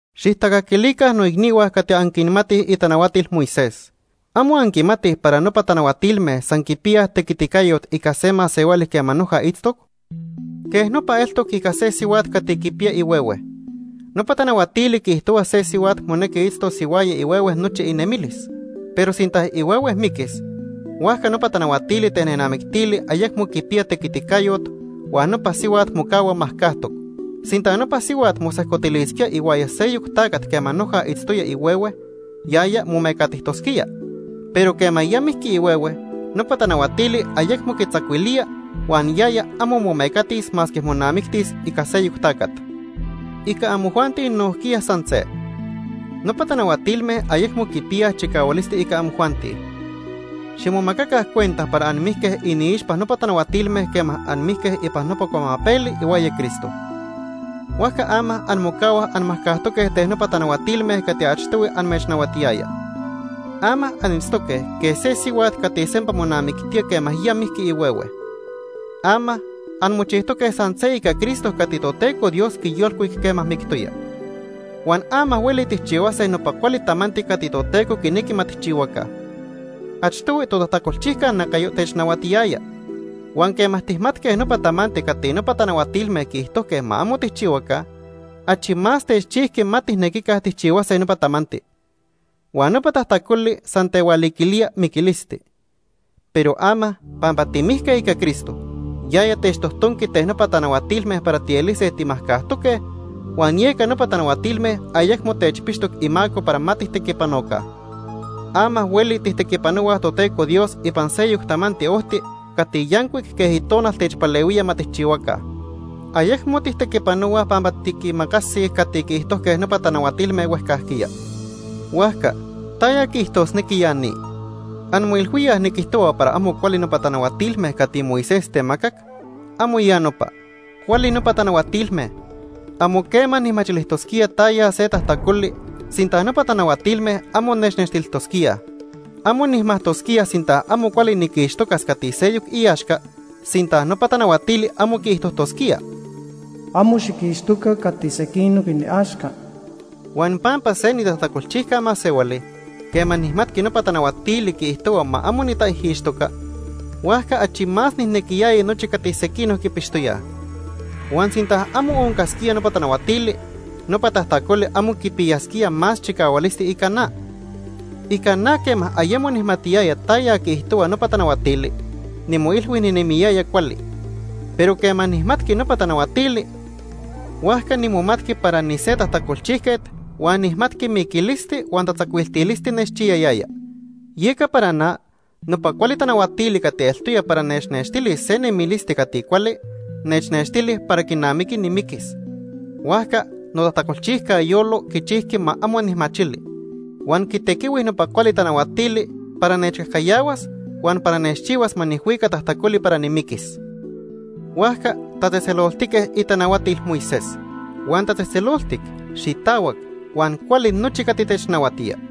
Xijtacaquilica noicnihua cati anquinmatij itanahuatil Moisés. ¿Amo anquimatij para nopa tanahuatilme san quipiyaj tequiticayot ica se masehuali quema noja itztoc? Quej nopa eltoc ica se sihuat cati quipiya ihuehue. Nopa tanahuatili quiijtohua se sihuat monequi itztos ihuaya ihuehue nochi inemilis. Pero sinta ihuehue miquis, huajca nopa tanahuatili ten nenamictili ayecmo quipiya tequiticayot, huan nopa sihuat mocahua majcajtoc. Sinta nopa sihuat mosejcotilisquía ihuaya seyoc tacat quema noja itztoya ihuehue, yaya momecatijtosquía. Pero quema ya mijqui ihuehue, nopa tanahuatili ayecmo quitzacuilía huan yaya amo momecatis masque monamictis ica seyoc tacat. Ica amojuanti nojquiya san se. Nopa tanahuatilme ayecmo quipiyaj chicahualisti ica amojuanti. Ximomacaca cuenta para anmijque iniixpa nopa tanahuatilme quema anmijque ipan nopa cuamapeli ihuaya Cristo. Huajca ama anmocahuaj anmajcajtoque ten nopa tanahuatilme cati achtohui amechnahuatiyaya. Ama anitztoque quej se sihuat cati sempa monamictía quema ya mijqui ihuehue. Ama anmochijtoque san se ica Cristo cati Toteco Dios quiyolcuic quema mictoya. Huan ama hueli tijchihuase nopa cuali tamanti cati Toteco quinequi ma tijchihuaca. Achtohui totajtacolchijca nacayo technahuatiyaya. Huan quema tijmatque nopa tamanti cati nopa tanahuatilme quiijtojque ma amo tijchihuaca, achi más techchijqui ma tijnequica tijchihuase nopa tamanti. Huan nopa tajtacoli san tehualiquilía miquilisti. Pero ama pampa timijque ica Cristo, yaya techtojtonqui ten nopa tanahuatilme para tielise timajcajtoque huan yeca nopa tanahuatilme ayecmo techpixtoc imaco para ma tijtequipanoca. Ama hueli tijtequipanohuaj Toteco Dios ipan seyoc tamanti ojti cati yancuic quej Itonal techpalehuía ma tijchihuaca. Ayecmo tijtequipanohuaj pampa tiquimacasij cati quiijtojque nopa tanahuatilme huejcajquiya. Huajca ¿taya quiijtosnequi ya ni? ¿Anmoilhuíaj niquijtohua para amo cuali nopa tanahuatilme cati Moisés temacac? ¡Amo ya nopa! Cuali nopa tanahuatilme. Amo quema nijmachilijtosquía taya se tajtacoli sinta nopa tanahuatilme amo nechnextilijtosquíaj. Amo nijmajtosquía sinta amo cuali niquixtocas cati seyoc iaxca sinta nopa tanahuatili amo quiijtojtosquía: “Amo xiquixtoca cati sequinoc iniaxca.” Huan pampa se nitajtacolchijca masehuali, quema nijmatqui nopa tanahuatili quiijtohua ma amo nitaijixtoca, huajca achi más nijnequiyaya nochi cati sequinoc quipixtoyaj. Huan sinta amo oncasquía nopa tanahuatili, nopa tajtacoli amo quipiyasquía más chicahualisti ica na. Ica na quema ayemo nijmatiyaya taya quiijtohua nopa tanahuatili, nimoilhui ninemiyaya cuali, pero quema nijmatqui nopa tanahuatili, huajca nimomatqui para nise tajtacolchijquet huan nijmatqui miquilisti huan tatzacuiltilisti nechchiyayaya. Yeca para na, nopa cuali tanahuatili cati eltoya para nechnextilis se nemilisti cati cuali, nechnextili para quinamiqui nimiquis. Huajca notajtacolchijca yolo quichijqui ma amo nijmachili, huan quitequihui nopa cuali tanahuatili para nechcajcayahuas huan para nechchihuas ma nijhuica tajtacoli para nimiquis. Huajca tatzejtzeloltique itanahuatil Moisés. Huan tatzejtzeloltic, xitahuac huan cuali nochi cati technahuatía.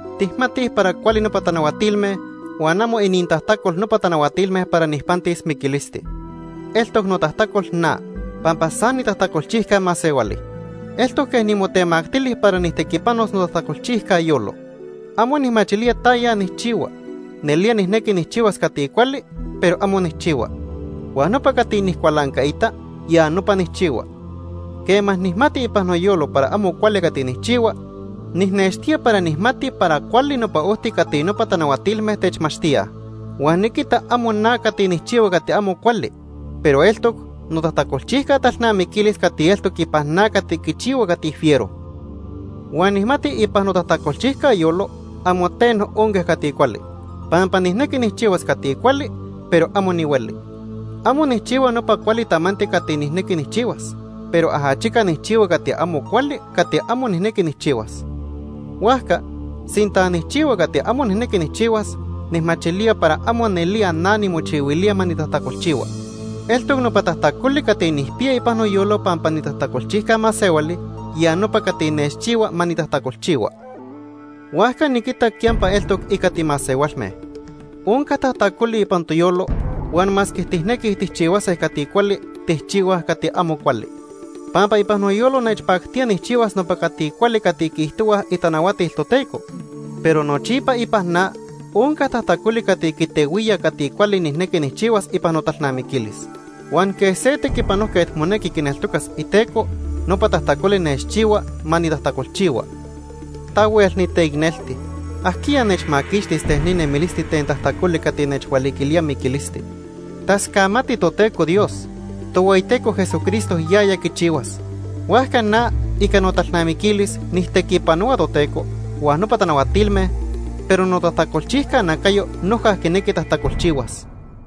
Tijmatij para cuali nopa tanahuatilme huan amo inintajtacol nopa tanahuatilme para nijpantis miquilisti. Eltoc notajtacol na, pampa san nitajtacolchijca masehuali. Eltoc quej nimotemactili para nijtequipanos notajtacolchijca yolo. Amo nijmachilía taya nijchihua. Nelía nijnequi nijchihuas cati cuali, pero amo nijchihua. Huan nopa cati nijcualancaita, ya nopa nijchihua. Quema nijmati ipan noyolo para amo cuali cati nijchihua, nijnextía para nijmati para cuali nopa ojti cati nopa tanahuatilme techmachtíaj. Huan niquita amo na cati nijchihua cati amo cuali, pero eltoc notajtacolchijca talnamiquilis cati eltoc ipan na cati quichihua cati fiero. Huan nijmati ipan notajtacolchijca yolo, amo teno onca cati cuali, pampa nijnequi nijchihuas cati cuali, pero amo nihueli. Amo nijchihua nopa cuali tamanti cati nijnequi nijchihuas, pero ajachica nijchihua cati amo cuali cati amo nijnequi nijchihuas. Huajca, sinta nijchihua cati amo nijnequi nijchihuas, nijmachilía para amo nelía na nimochihuilía ma nitajtacolchihua. Eltoc nopa tajtacoli cati nijpiya ipan noyolo pampa nitajtacolchijca masehuali, ya nopa cati nechchihua ma nitajtacolchihua. Huajca niquita quiyampa eltoc ica timasehualme. Onca tajtacoli ipan toyolo, huan masque tijnequij tijchihuase cati cuali, tijchihuaj cati amo cuali. Pampa ipan noyolo nechpactía nijchihuas nopa cati cuali cati quiijtohuaj itanahuatil Toteco, pero nochipa ipan na onca tajtacoli cati quitehuía cati cuali nijnequi nijchihuas ipan notalnamiquilis. Huan quej se tequipanojquet monequi quineltocas iteco, nopa tajtacoli nechchihua ma nitajtacolchihua. ¡Tahuel niteicnelti! ¿Ajquiya nechmaquixtis ten ni nemilisti ten tajtacoli cati nechhualiquilía miquilisti? Tascamati Toteco Dios. Tohueyiteco Jesucristo yaya quichihuas. Huajca na ica notalnamiquilis nijtequipanohua Toteco huan nopa tanahuatilme, pero notajtacolchijca nacayo noja quinequi tajtacolchihuas.